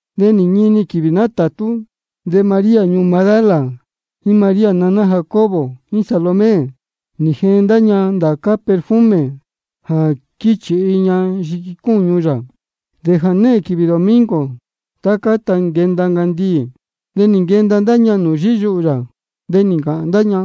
De nī ñini quīvī nátātú, de María ñuū Magdala, jíín María naná Jacobo, jíín Salomé, nī jeen ndá ña ndācá perfume jā quíchīhi ña yiqui cúñu yā. De jānehēn quīvī domingo, tá cáta nquenda ncandiī, de nī nquenda ndá ña nūū yíyuhū yā. De nī ncāhān ndá ña: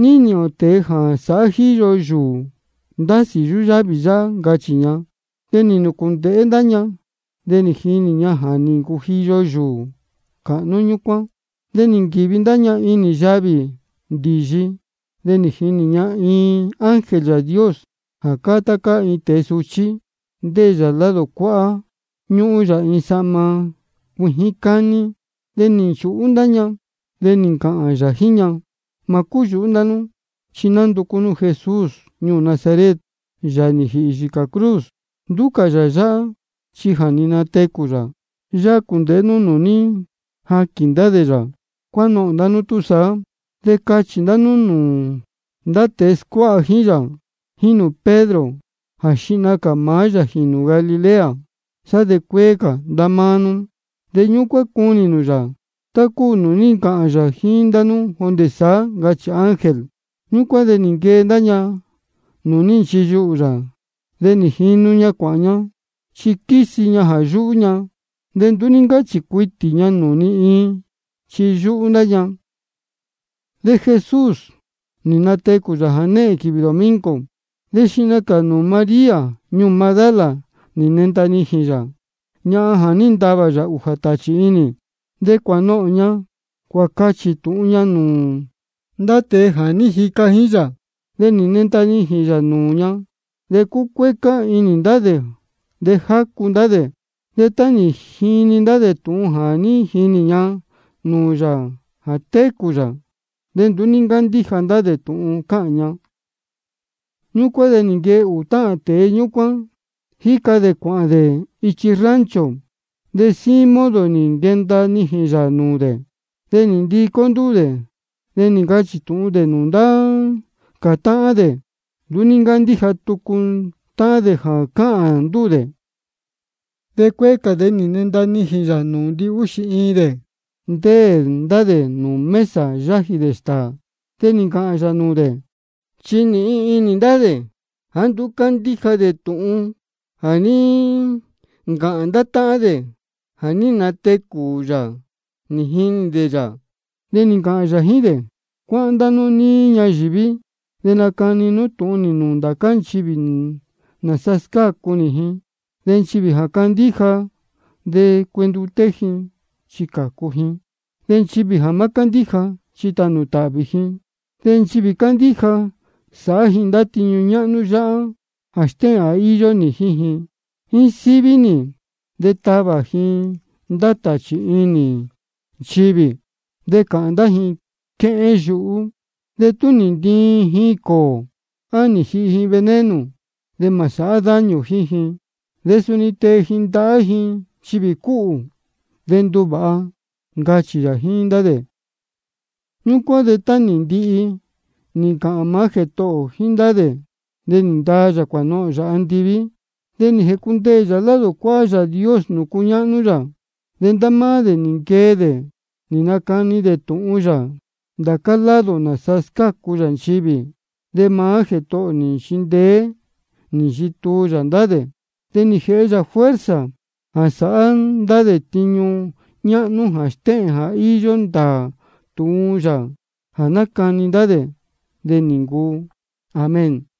¿Ní nīhīn ō tēe jā sāhá jíyo yūū ndásī yúyávī yáhá? ncachī ña. De nī nūcūndēhé ndá ña, de nī jinī ña ja nī ncujiyo yūū cāhnú ñúcuán. De nī nquīvi ndá ña inī yavī ndīyi. De nī jinī ña iin ángel Yāā Dios jā cáá tá cáá tēe suchí, ndéē yā lado cuáhá, ñúhún yā iin sahma cuijín cání. De nī nchūhú ndá ña. De nī ncāhān yā jíín ña: Mā cúyūhú ndá nú. Chi nánducú ndá nú Jesús ñuū Nazaret, Yāā nī jīhī yīcā cruz. Nduú cā yā yáhá, chi ja nī natecū yā. Yáhá cūndēhé nú nūū ní jaquīn ndá dē yā. Cuánohōn ndá nú túsaá, de cachī nū nūū ndá tēe scuáha jíín yā, jíín nūū Pedro, jā xihna cā maá yā jīnū Galilea, sá de cuēē ndá máá nú. De ñúcuán cunī nū nūū yā, tá cúu nūū ní ncāhān yā jíín nú jondē saá, ncachī ángel. Ñúcuán de nī nquee ndá ña nūū ní nchiyuhū yā, de jínu ña cuāhān ña. Chi quísi ña jā yúhú ña. De nduú ní ncáchī cuitī ña nūū ni iin, chi yúhú ndá ña. De Jesús nī natecū yā jānehēn quīvī domingo. De xihna cā nūū María ñuū Magdala nī nenda nijīn yā, ñahan jā ní ntavā yā ūjā tāchī inī. De cuānohōn ña cuācachī tūhun ña nūū ndá tēe jā ní jica jíín yā, jā ní nenda nijīn yā nūū ña. De cúcuécá inī ndá dē de jácu ndá dē. De tá nī jini ndá dē tūhun jā ní jinī ña nūū yā jā técū yā, de nduú ní ncándíja dē tūhun cáhān ña. Ñúcuán de nī nquee ūū táhān tēe ñúcuán, jíca dē cuāhān dē ichi rancho, de síín modo nī nquenda nijīn yā nūū dē. De nī ndicó ndúū dē, de nī ncachī tūhun dē nūū ndá cā táhán dē. De nduú ní ncándíja tucu táhán dē jā cáhān ndúū dē. De cuéé cā de nī nenda nijīn yā nūū ndihúxī iin dē, ndéē ndá dē nūū mesa yájī dē stāā. De nī ncāhān yā nūū dē, chi nīhin inī ndá dē jāá nduú cándíja dē tūhun jā ní ncāhān ndá táhán dē jā ní natecū yā nī jinī dē yā. De nī ncāhān yā jíín dē: Cuáhán ndá nú níí ñayīví, de nacani nú tūhun nī nūū ndācá nchivī nāsa scácu nī ji. De nchivī jā candíja de cuenduté ji, chi cācu ji. De nchivī jā má cándíja, chi tānū tāhvī ji. De nchivī candíja, sāhá ji ndá tiñu ñáhnú yáhá jā stéhēn jā íyó nī jíín ji: Jíín síví nī de tavā ji ndá tāchī inī nchivī. De cāhān ji quéhén yuhú jéé. De tú nī ntiin ji cōō, á nī jihi ji veneno, de mā sāhá daño jíín ji. De suni tee ji ndahá ji nchivī cúhū, de nduvāha, ncachī yā jíín ndá dē. Ñúcuán de tá nī ndihi nī ncāhān maá Jētohō ō jíín ndá dē, de nī ndaa yā cuānohōn yā andiví, de nī jēcundeē yā lado cuáhá Yāā Dios nūū cúñáhnú yā. De ndá máá dē nī nquee dē, nī nacani dē tūhun yā ndācá lado nāsa scácu yā nchivī. De maá Jētohō ō nī nchindeé nī nchituu yā ndá dē. De nī jēhe yā fuerza jā sāhá dē ndá tiñu ñáhnú jā stéhēn jā íyó ndāā tūhun yā jā nácani ndá dē. De nī ncuu. Amén.